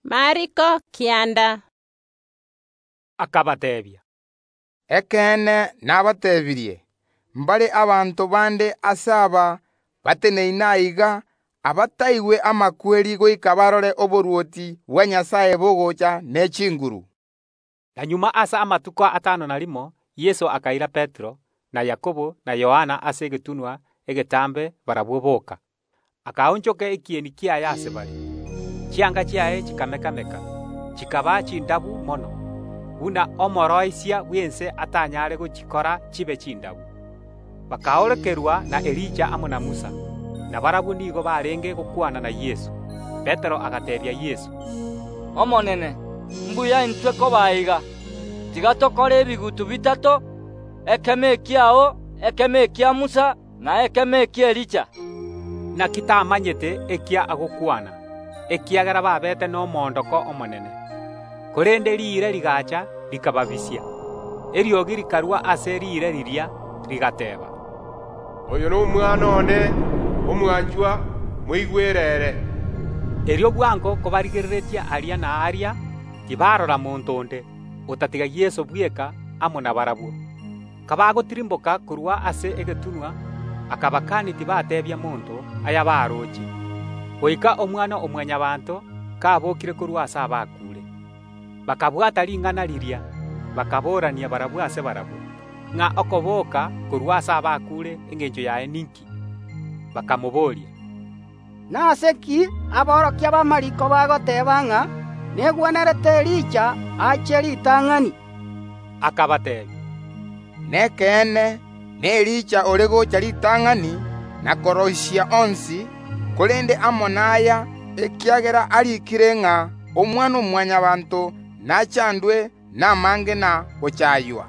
Yeso akagenderera kobateebia, “Ekeene nabateebirie: Mbare abanto bande ase aba bateneine aiga, abataetere amakweri goika barorire oborwoti bwa Nyasae bogocha ne chinguru.” Na magega ase amatuko atano na rimo Yeso akaira Petero, na Yakobo, na Yohana, ase egetunwa egetambe barabwo boka, akaonchoka ekieni kiaye ase bare. Chianga chiaye chikameka‐meka, chikaba chindabu mono, buna omosibia onde ase ense atanyare gochisibia chibe chindabu. Bakaorokerwa na Elija amo na Musa; na barabwo nigo barenge gokwana na Yeso. Petero agateebia Yeso, “Omwarimu, mbuya intwe koba aiga, tiga tokore ebigutu bitato: ekemo ekiao, ekemo kia Musa, na ekemo ki’Elija.” Inaki tamanyete eki agokwana, ekiagera babete nomoondoko omonene. Korende riire rigaacha rikababisia; eriogi rikarwa ase riire riria, rigateeba, “Oyo n’Omwana one omwanchwa, moigwere ere!” Erio bwango kobarigereirie aria na aaria, tibarora monto onde, otatiga Yeso bweka amo nabarabwo. Kabagotirimboka korwa ase egetunwa akabakania tibatorera monto ayabaroche, goika Omwana-o-Mwanyabaanto kabokire korwa ase abakuure. Bakabwata ring’ana riria, bakaboorania barabwo ase barabwo, ng’a okoboka korwa ase abakuure, engencho yaye ninki. Bakabooria Yeso, “Nase ki aborokia b’amariiko bagoteeba ng’a negwenerete Elija ache ritang’ani?” Akabateebia, “Nekeene Elija ogocha ritang’ani, na koroisia onsi; korende amo naya, ekiagera ariikire ng’a Omwana-o-Mwanyabaanto nachandwe namange na gochaaywa?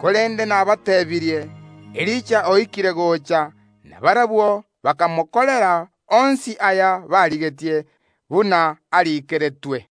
Korende nabateebirie: Elija oikire gocha, na barabwo bakamokorera onsi aya barigetie, buna ariikeretwe.”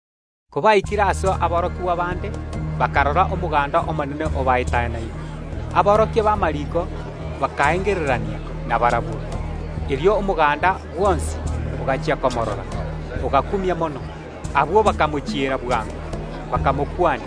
Kobaikire ase aborokigwa bande, bakarora omoganda omonene obaetanaine; aborokia b’amariiko bakaengererania nabarabwo. Erio omoganda bwonsi, ogachia korora Yeso, ogakumia mono; abwo bakamochiera bwango, bakamokwania.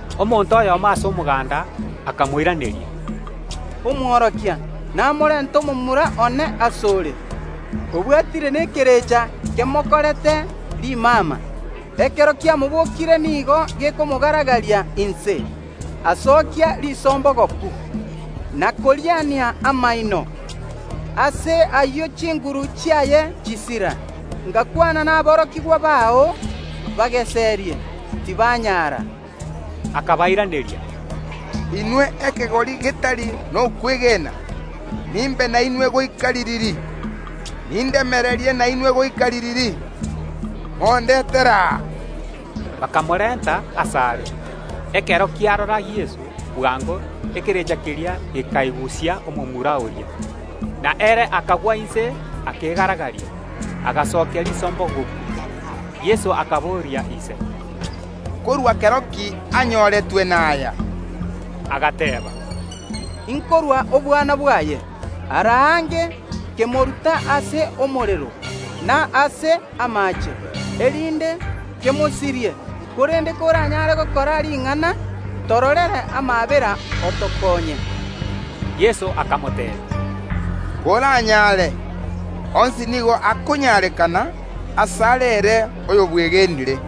Omonto oyomo ase omoganda akamoiraneria, “Omworokia, namorenta omomura one ase ore, obwatire nekerecha kemokorete rimama; ekero kiamobokire nigo gekomogaragaria inse, asokia risombogoku, na koriania amaino; ase ayio chinguru chiaye chisira. Ngakwana naborokigwa bao bageserie, tibanyara.” Yeso akabairaneria, “Inwe ekegori getari nokwegena, nimbe nainwe goika ririri? Nindemererie nainwe goika ririri? Mondetere aa!” Bakamorenta asare. Ekero kiarora Yeso, bwango ekerecha keria gekaigusia omomura oria, na ere akagwa inse akegaragaria, agasokia risombogoku. Yeso akaboria ise, “Nkorwa kero ki anyoretwe naya?” Agateeba, “Nkorwa obwana bwaye. Ara aange kemoruta ase omorero na ase amaache, erinde kemosirie, korende koranyare gokora ring’ana, tororere amaabera, otokonye.” Yeso akamoteebia, “Koranyare! Onsi nigo akonyarekana asare ere oyobwegenire.”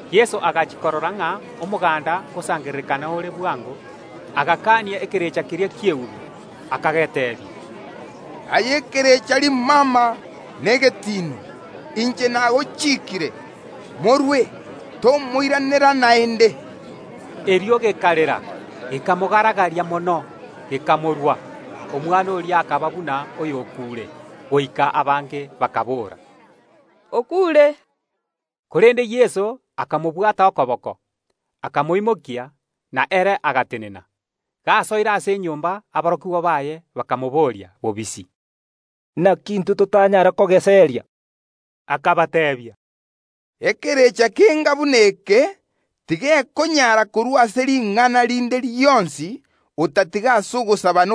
Yeso agachia korora ng’a omoganda ngosangererekana ore bwango, agakania ekerecha keria ki’eubi, akageteebia, “Aye ekerecha rimama na egetiino, inche nagochiikire, morwe, tomoiranera naende!” Erio gekarera, gekamogaragaria mono gekamorwa. Omwana oria akaba buna oyokuure, goika abange bakaboora, “Okuure.” Korende Yeso akamobwata okoboko, akamoimokia, na ere agatenena. Gasoire ase enyomba, aborokigwa baye bakamobooria bobisi, “Inaki intwe totanyara kogeseria?” Akabateebia, “Ekerecha kenga buna eke tigekonyara korwa ase ring’ana rinde rionsi, otatiga ase ogosaba.”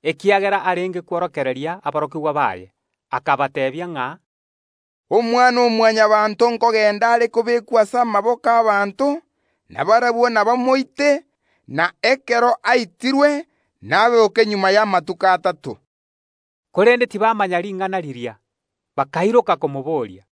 ekiagera arenge kworokereria aborokigwa baye, akabateebia ng’a, “Omwana-o-Mwanyabaanto nkogenda are kobekwa ase amaboko y’ abanto, na barabwo nabamoite, na ekero aitirwe naboke magega y’amatuko atato.” Korende tibamanya ring’ana riria, bakairoka komoboria.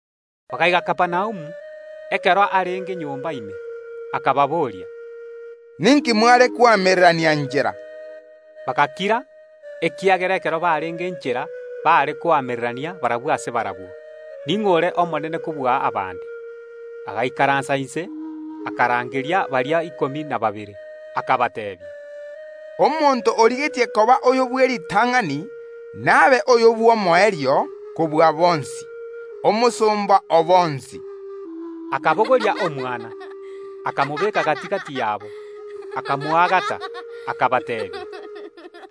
Bagaika Kapernaumu. Ekero arenge nyomba ime, Yeso akaboria aborokigwa baye, “Ninki mware koamererania inchera?” Bagakira, ekiagera ekero barenge inchera baare koamererania barabwo ase barabwo ning’o ore omonene kobua abande. Yeso agaikaransa inse, akarangeria baria ikomi na babere, akabateebia, “Omonto origetie koba oyo bw’eritang’ani nabe oyo bw’omoerio kobua bonsi, na boigo omosomba o bonsi.” Akabogoria omwana, akamotenenia gati‐gati yaabo, akamoagata, akabateebia,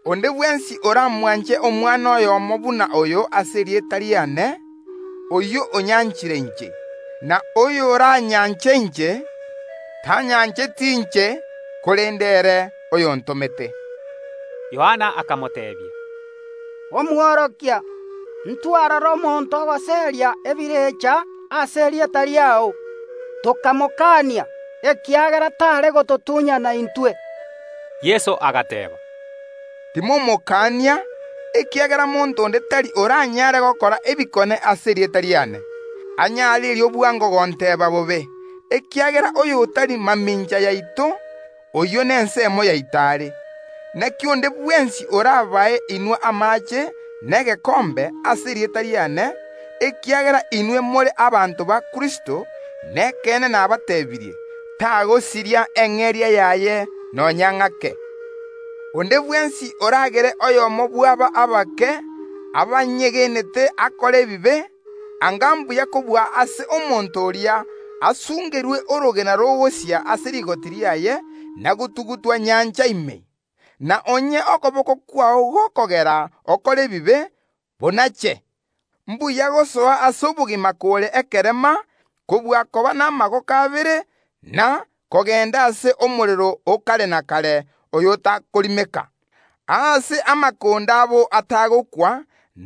“Onde bwensi oramwanche omwana oyomo buna oyo ase erieta riane, oyio onyanchire inche; na oyoranyanche inche, tanyancheti inche, korende ere oyontomete.” Yohana akamoteebia, “Omworokia, ntwarora omonto ogoseria ebirecha ase erieta riao; tokamokania, ekiagera tare gototunyana intwe.” Yeso agateeba, “Timomokania, ekiagera monto onde tari oranyare gokora ebikone ase erieta riane, anyare erio bwango gonteeba bobe, ekiagera oyo otari mamincha yaito, oyio nenseemo yaito are. Inaki onde bwensi orabae inwe amaache negekombe ase erieta riane, ekiagera inwe more abanto ba Kristo, nekeene nabateebirie: Tagosiria eng’eria yaye nonya ng’ake. “Onde bwensi oragere oyomo bw’aba abake abanyegenete akore ebibe, anga mbuya kobua ase omonto oria asungerwe orogena rogosia ase rigoti riaye, na gotugutwa ime y’enyancha. Na onye okoboko kwao gokogera okore ebibe, konache; mbuya gosoa ase obogima kore ekerema, kobua koba namaboko abere, na kogenda Yeanamu [ase omorero o kare na kare oyo otakorimeka, naboigo amakonde abo tagokwa].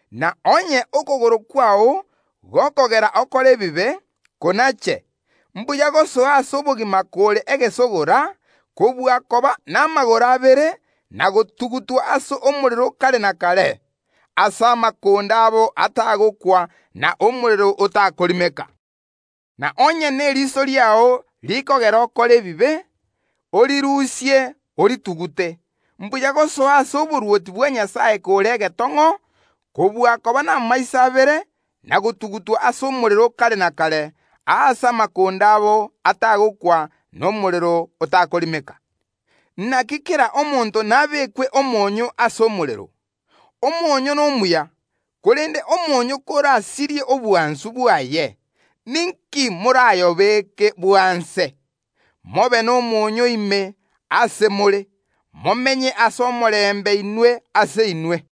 Na onye okogoro kwao gokogera okore ebibe, konache; mbuya gosoa ase obogima kore egesegora, kobua koba n’amagoro abere, na gotugutwa Yeanamu [ase omorero o kare na kare aase amakonde abo atagokwa, na omorero otakorimeka]. Na onye neriso riao rikogera okore ebibe, orirusie oritugute; mbuya gosoa ase oborwoti bwa Nyasae kore egetong’o, kobua koba namaiso abere, na gotugutwa Yeanamu [ase omorero o kare na kare, aase amakonde abo atagokwa na omorero otakorimeka]. “Inaki kera omonto nabekwe omoonyo ase omorero. Omoonyo nomuya, korende omonyoo korasirie obwansu bwaye, ninki morayobeke bwanse? Mobe n’omoonyo ime ase more, momenye ase omorembe inwe ase inwe.”